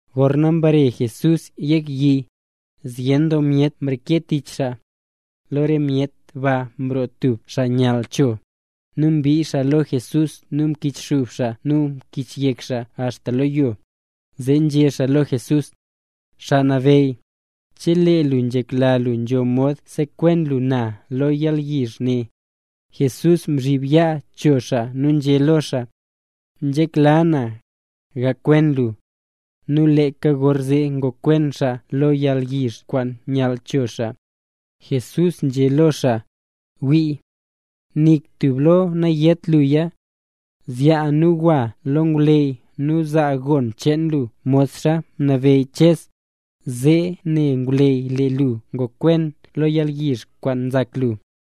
Gorna mbare Jesús yek yi, zyen doo myet mreke tich xaa. Lo re myet ba mroo tub xaa nyall cho, nu mbii xaa lo Jesús nu mkichxub xaa nu mkichyek xaa axta lo yo, zee nzhé xaa lo Jesús: —Xaa Nabeyy, chelee lu nzhekla lu nzho mod sekwen lu na lo yalyizh ne. Jesús mzhib yaa cho xaa nu nzhé lo xaa: —Nzhekla na, gakwen lu. Nu leeka gorzee ngokwen xaa lo yalyizh kwaan nyall cho xaa. Jesús nzhé lo xaa: —Wii, nik tub lo nayét luya. Zyaa nu gwa lo ngwleyy nu zaa gon cheen lu modxa mnabeyy Ches, zee ne ngwleyy lee lu ngokwen lo yalyizh kwaan nzak lu.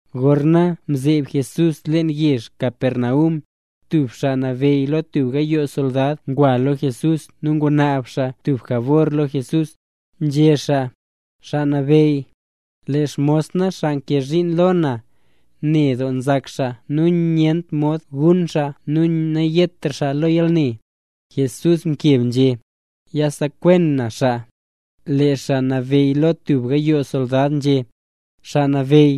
Gorna nzhazeeb Jesús leen yezh Capernaum, tub xaa nabeyy lo tub gayoo soldad ngwa lo Jesús nu ngunaab xaa tub jabor lo Jesús, nzhé xaa: —Xaa Nabeyy, lee xmos na xaa nkee zhiin lo na, ne doo nzak xaa nu nyent mod gun xaa nu nayetra xaa lo yalne. Jesús mkeb nzhé: —Yasekwen na xaa. Lee xaa nabeyy lo tub gayoo soldad nzhé: —Xaa Nabeyy,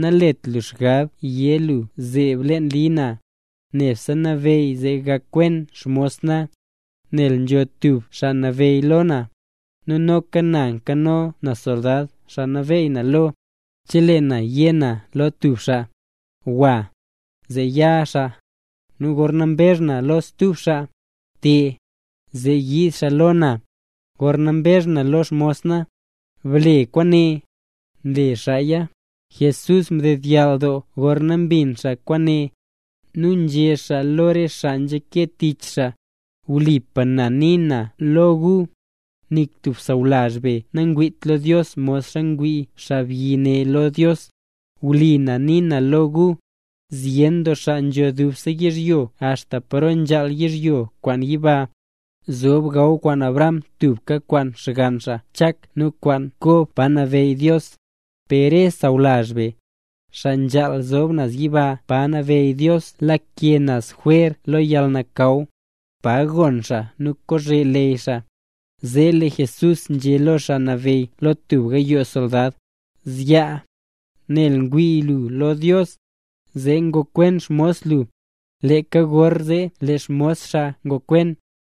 nalet lu xgab yé lu zeeb leen li na, nebse nabeyy zee gakwen xmos na. Nel nzho tub xaa nabeyy lo na, nu noka na nkano na soldad xaa nabeey na lo. Chelee na yé na lo tub xaa: “Gwa”, zee ya xaa; nu gorna mbezh na lo stub xaa: “Te”, zee nyiid xaa lo na; gorna mbezh na lo xmos na: “Ble kwaane”, nle xaaya. Jesús mdedyall doo gorna mbin xaa kwaane, nu nzhé xaa lo re xaa nzhake tich xaa: —Wlipa na nii na lo gu, ¡nik tub sawlazh be nangwiit lo Dios modxa ngwii xaabyi ne lo Dios! Wlipa na nii na lo gu, zyen doo xaa nzho dubse yizhyo axta paro nzhaal yizhyo kwaan yiba, zob gaw kwaan Abraham tubka kwaan xgann xaa Chak nu kwaan Kob pa nabeyy Dios, per re xaa sawlazh be, xaa nzhaal zob naz yiba pa nabeyy Dios lake naz jwer lo yalnakaw, pa gonn xaa nu kozhe leyy xaa. Zee lee Jesús nzhé lo xaa nabeyy lo tub gayoo soldad: —Zyaa, nel ngwii lu lo Dios, zee ngokwen xmos lu. Leeka gorzee lee xmos xaa ngokwen.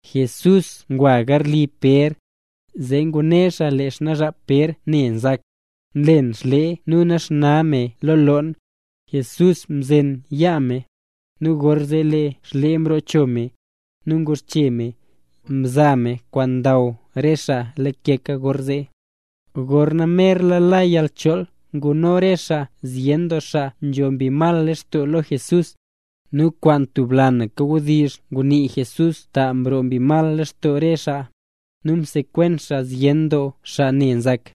Jesús ngwa garli Pér, zee ngune xaa lee xnaazhap Pér ne nzak, nlen xlee nu naxna me lo loon. Jesús mzen yaa me, nu gorzee lee xlee mroo cho me. Nu nguxche me, mzaa me kwaan ndaw re xaa leeka gorzee. Gorna merla la yalchool nguno re xaa zyen doo xaa nzho mbi mal lextoo lo Jesús, nu kwaan tub lanaka wdizh ngunii Jesús ta mroo mbi mal lextoo re xaa, nu msekwen xaa zyen doo xaa ne nzak.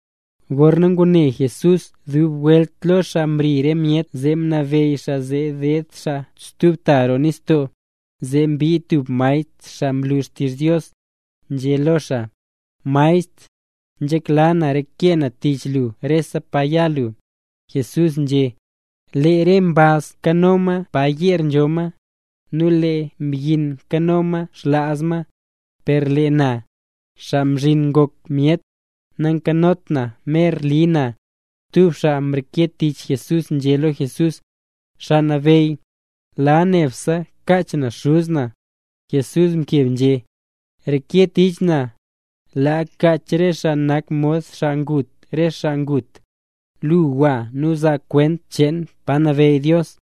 Gorna ngune Jesús dub welt lo xaa mri re myet, zee mnabeyy xaa zee deed xaa stub ta roo nistoo. Zee mbii tub maestr xaa nlu xtizh Dios, nzhé lo xaa: —Maestr, nzhekla na reke na tich lu rese pa ya lu. Jesús nzhé: —Lee re mbaz nkano ma yeer pa nzho ma, nu lee re mbyin nkano ma xlaaz ma; per lee na, Xaa Mzhin Ngok Myet, nankanot na mer li na. Stub xaa mreke tich Jesús nzhé lo Jesús: —Xaa Nabeyy, laa nebse kach na xuz na. Jesús mkeb nzhé: —Reke tich na, laa kach re xaa nak mod xaa ngut re xaa ngut. Lu, gwa nu bzaa kwent cheen pa nabeyy Dios.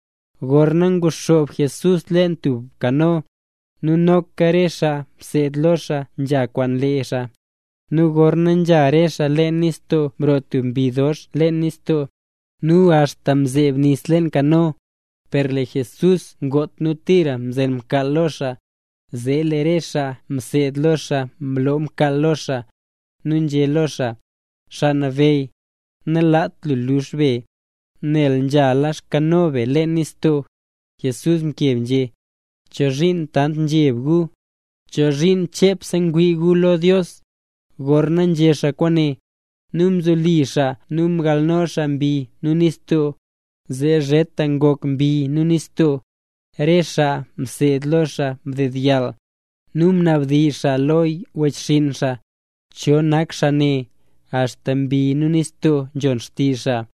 Gorna nguxoob Jesús leen tub kano, nu noka re xaa mseed lo xaa nzha kwaan lee xaa. Nu gorna nzha re xaa leen nistoo mroo tub mbi dox doo leen nistoo, nu axta mzeeb nis leen kano. Per lee Jesús ngot nu tira mzen mkaal lo xaa. Zee lee re xaa mseed lo xaa mloo mkaal lo xaa, nu nzhé xaa lo xaa: —Xaa Nabeyy, nalaat lu lux be, nel nzhala xkano be leen nistoo. Jesús mkeb nzhé: —¿Chozhiin tant nzheb gu? ¿Chozhiin chepse ngwii gu lo Dios? Gorna nzhé xaa kwaane, nu mzoli xaa nu mgalno xaa mbi nu nistoo, zee zheta ngok mbi nu nistoo. Re xaa mseed lo xaa mdedyall, nu nabdizh xaa lo wechxinn xaa: —¿Cho nak xaa ne, axta mbi nu nistoo nzhon xtizh xaa?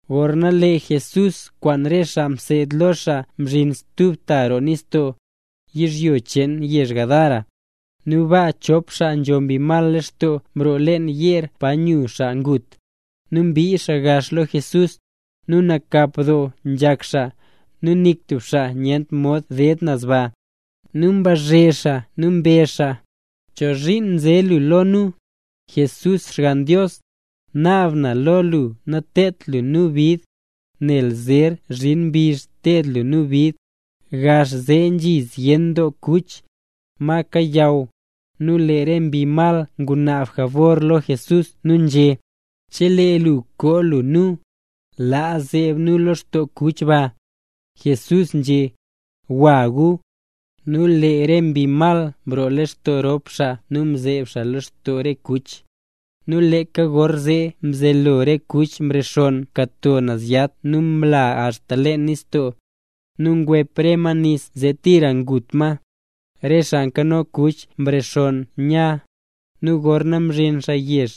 Gorna lee Jesús kwaan re xaa mseed lo xaa mzhin stub ta roo nistoo, yizhyo cheen yezh Gadara. Nu baa chop xaa nzho mbi mal lextoo mroo leen yeer pa nyu xaa ngut, nu mbii xaa gax lo Jesús. Nu nakap doo nzhak xaa, nu nik tub xaa nyent mod ded naz ba. Nu mbazhe xaa nu mbezh xaa: —¿Chozhiin nze lu lo nu, Jesús Xgann Dios? ¡Naab na lo lu nateed lu nu bid, nel zer zhin mbizh ted lu nu bid! Gax zee nzhi zyen doo kuch, ma kayaw. Nu lee re mbi mal ngunaab jabor lo Jesús nu nzhé: —Chelee lu koo lu nu, laa zeeb nu lextoo re kuch ba. Jesús nzhé: —¡Gwa gu! Nu lee re mbi mal mroo lextoo rop xaa, nu mzeeb xaa lextoo re kuch. Nu leeka gorzee mzelo re kuch mrexonn mkato naz yat nu mla axta leen nistoo. Nu ngwep re ma nis zee tira ngut ma. Re xaa nkano kuch mrexonn nya, nu gorna mzhin xaa yezh,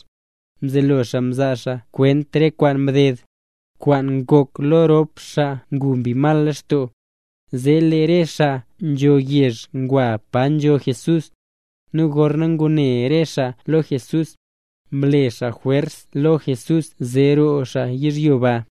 mzelo xaa mzaa xaa kwent re kwaan mded, kwaan ngok lo rop xaa ngu mbi mal lextoo. Zee lee rese xaa nzho yezh ngwa pa nzo Jesús. Nu gorna ngune re xaa lo Jesús, mle xaa jwers lo Jesús zee roo xaa yizhyo ba.